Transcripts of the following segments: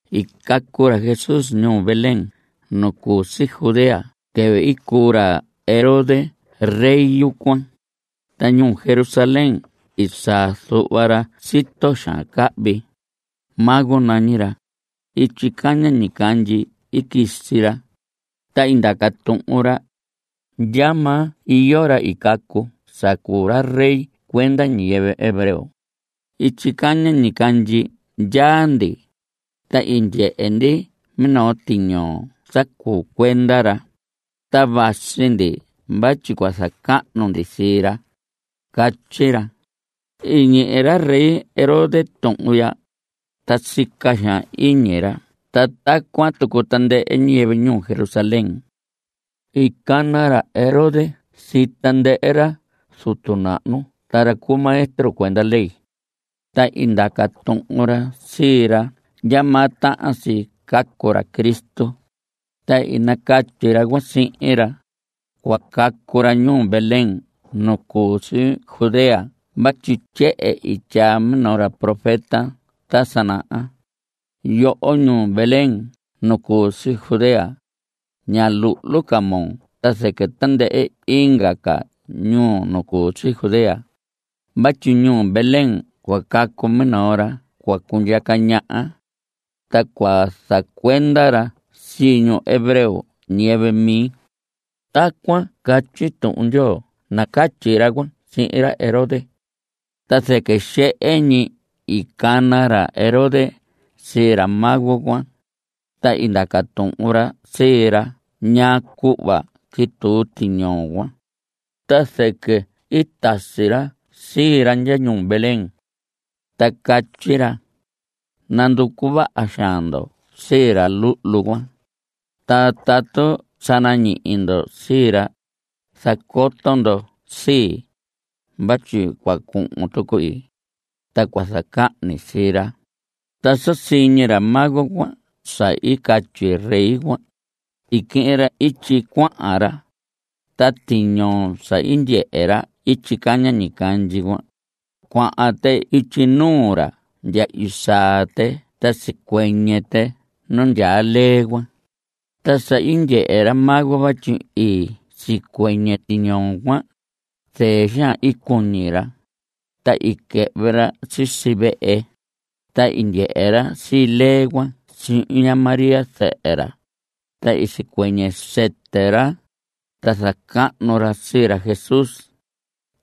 I cacu ra Jesús ñuu Belén nu cu si Judea quɨvɨ i cuu ra Herodes rey yucuan. Ta ñuu Jerusalén i saa zuhva ra sito xaan cahvi. Mago nañi ra. Ityi caña ñicandyi i quisi ra. Ta i ndaca tuhun ra: ¿Ndyamaa iyo ra i cacu sa cuu ra rey cuenda ñiyɨvɨ hebreo? Ityi caña ñicandyi ndyaa ndi, ta i ndyehe ndi minoo tiñoo sa cuu cuenda ra. Ta vasi ndi vatyi cua zacahnu ndi sii ra. Catyi ra. I ñihi ra rey Herodes tuhun ya, ta sica xaan iñi ra ta tacuan tucu tandɨhɨ ñiyɨvɨ ñuu Jerusalén. I cana ra Herodes sii tandɨhɨ ra zutu nahnu ta ra cu maestro cuenda ley, ta i ndaca tuhun ra sii ra ndyamaa tahan si cacu ra Cristo. Ta i nacatyi ra cuan sihin ra: Cua cacu ra ñuu Belén nu cu si Judea vatyi tyehen i tyaa minoo ra profeta ta sa naha: Yoho ñuu Belén nu cu si Judea, ña luhlu ca moo ta zɨquɨ tandɨhɨ inga ca ñuu nu cu si Judea. Vatyi ñuu Belén cua cacu minoo ra cua cundyaca ñaha, ta cua zacuenda ra sii ñu hebreo, ñiyɨvɨ mi. Tacuan catyi Tuhun Ndyoo nacatyi ra cuan sihin ra Herodes. Ta zɨquɨ xehe ñi i cana ra Herodes sii ra mago cuan, ta i ndaca tuhun ra sii ra ñaa cuhva quituu tiñoo cuan. Ta zɨquɨ i tasi ra sii ra ndya ñuu Belén, ta catyi ra: Nanducu vaha xaan ndo sii ra luhlu cuan. Ta tatu sa nañihi ndo sii ra, zacoto ndo sii, vatyi cua cuhun tuqui, ta cua zacahni sii ra. Ta sa siñi ra mago cuan sa i catyi rey cuan, i quihin ra ityi cuahan ra. Ta tiñoo sa i ndyehe ra ityi caña ñicandyi, cuahan tɨ ityi nuu ra ndya i saa tɨ ta sicuɨñɨ tɨ nu ndyaa lee cuan. Ta sa i ndyehe ra mago vatyi i sicuɨñɨ tiñoo cuan, zɨɨ xaan i cuñi ra. Ta i quɨhvɨ ra sisi vehe, ta i ndyehe ra sii lee cuan sihin ña María zɨhɨ ra. Ta i sicuɨñɨ sɨtɨ ra, ta zacahnu ra sii ra Jesús.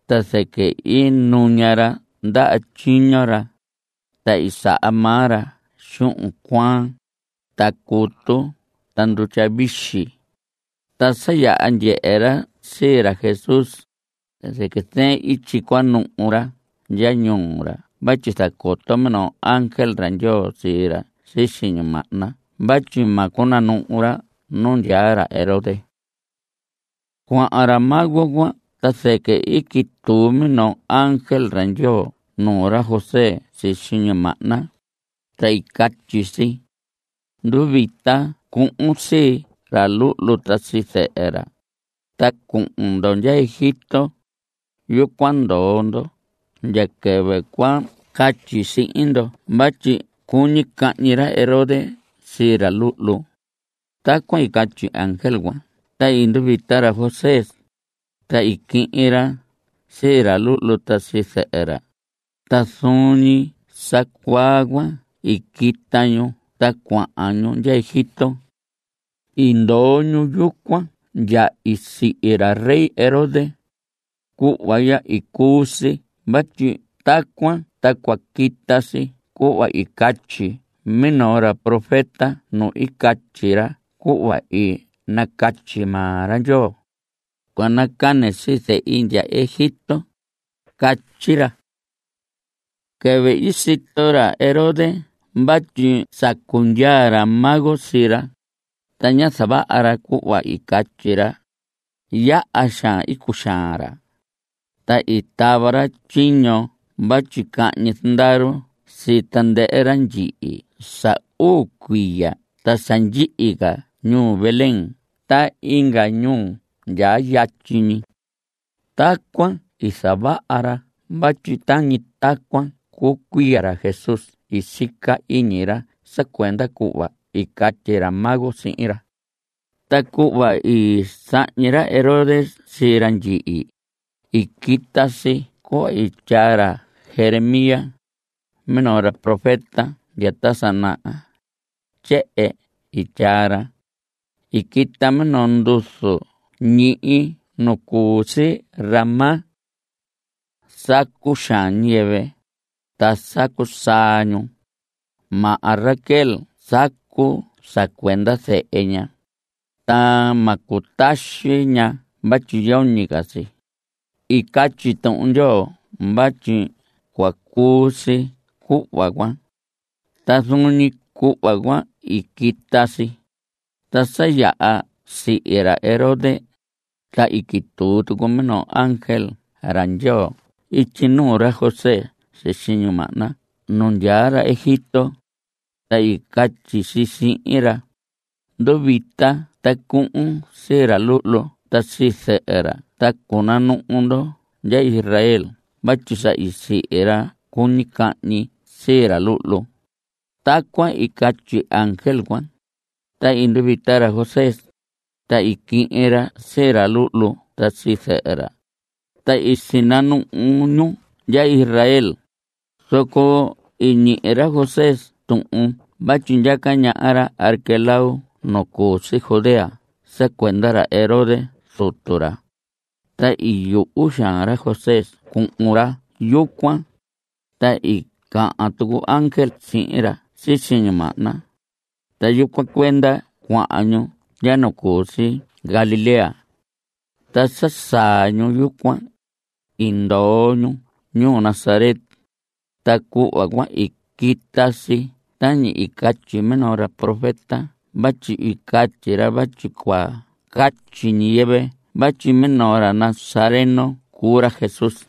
Ta zɨquɨ i nuña ra ndaha tyiño ra, ta i saha maa ra xuhun cuaan, ta cutu ta ndutya vixi. Ta sa yaha ndyehe ra sii ra Jesús, ta zɨquɨ zɨɨn ityi i cua nuhu ra ndya ñuu ra vatyi i zacoto minoo ángel ra Ndyoo sii ra sisi ñimahna vatyi ma cunanuhu ra nu ndyaa ra Herodes. Cuahan ra mago cuan ta zɨquɨ i quituu minoo ángel ra Ndyoo nuu ra José sisi ñimahna, ta i catyi si: Nduvita ta cuhun sii ra luhlu ta sii zɨhɨ ra, ta cuhun ndo ndya Egipto. Yucuan ndoo ndo ndya quɨvɨ cua catyi sihin ndo vatyi cuñi cahñi ra Herodes sii ra luhlu. Tacuan i catyi ángel cuan ta i nduvita ra José, ta i quihin ra sii ra luhlu ta sii zɨhɨ ra. Ta zuun ñi sa cuaa cuan i quita ñu ta cuahan ñu ndya Egipto. I ndoo ñu yucuan ndya i sihi ra rey Herodes. Cuhva ya i cuu si vatyi tacuan ta cua quita si cuhva i catyi minoo ra profeta nu i catyi ra cuhva i nacatyi maa ra Ndyoo: “Cua nacane sii Zehi ndya Egipto.” Catyi ra. Quɨvɨ i sito ra Herodes vatyi sacu ndyaa ra mago sii ra, ta ñá zavaha ra cuhva i catyi ra, yaha xaan i cuxaan ra. Ta i tava ra tyiño vatyi cahñi zandaru sii tandɨhɨ ra ndyihi sa uu cuiya ta sa ndyihi ca ñuu Belén ta inga ñuu ndyaa yatyi. Tacuan i zavaha ra vatyi tañi tacuan cuu cuiya ra Jesús sica iñi ra sa cuenda cuhva i catyi ra mago cuan sihin ra. Ta cuhva i sahñi ra Herodes sii ra ndyihi, i quita si cuhva i tyaa ra Jeremías, minoo ra profeta ta sa naha. Tyehen i tyaa ra: I quita minoo nduzu ñihi nu cu si Ramá. Sacu xaan ñiyɨvɨ, ta sacu saa ñu. Maha Raquel sacu sa cuenda zehe ña, ta ma cutaxi ña vatyi yoñi ca si. I catyi Tuhun Ndyoo vatyi cua cuu si cuhva cuan. Ta zuun ñi cuhva cuan i quita si. Ta sa yaha sihi ra Herodes, ta i quituu tucu minoo ángel ra Ndyoo ityi nuu ra José sisi ñimahna nu ndyaa ra Egipto, ta i catyi si sihin ra: Nduvita ta cuhun sii ra luhlu ta sii zɨhɨ ra ta cunanuhu ndo ndya Israel vatyi sa sihi ra cuñi cahñi sii ra luhlu. Tacuan i catyi ángel cuan, ta i nduvita ra José, ta i quihin ra sii ra luhlu ta sii zɨhɨ ra, ta i sinanuhu ñu ndya Israel. Zoco i ñihi ra José tuhun vatyi ndyaca ñaha ra Arquelao nu cu si Judea sa cuenda ra Herodes zutu ra, ta i yuhu xaan ra José cuhun ra yucuan. Ta i cahan tucu ángel sihin ra sisi ñimahna, ta yucuan cuenda cuahan ñu ndya nu cu si Galilea. Ta sa saa ñu yucuan, i ndoo ñu ñuu Nazaret. Ta cuhva cuan i quita si tañi catyi minoo ra profeta vatyi i catyi ra vatyi cua catyi ñiyɨvɨ vatyi minoo ra nazareno cuu ra Jesús.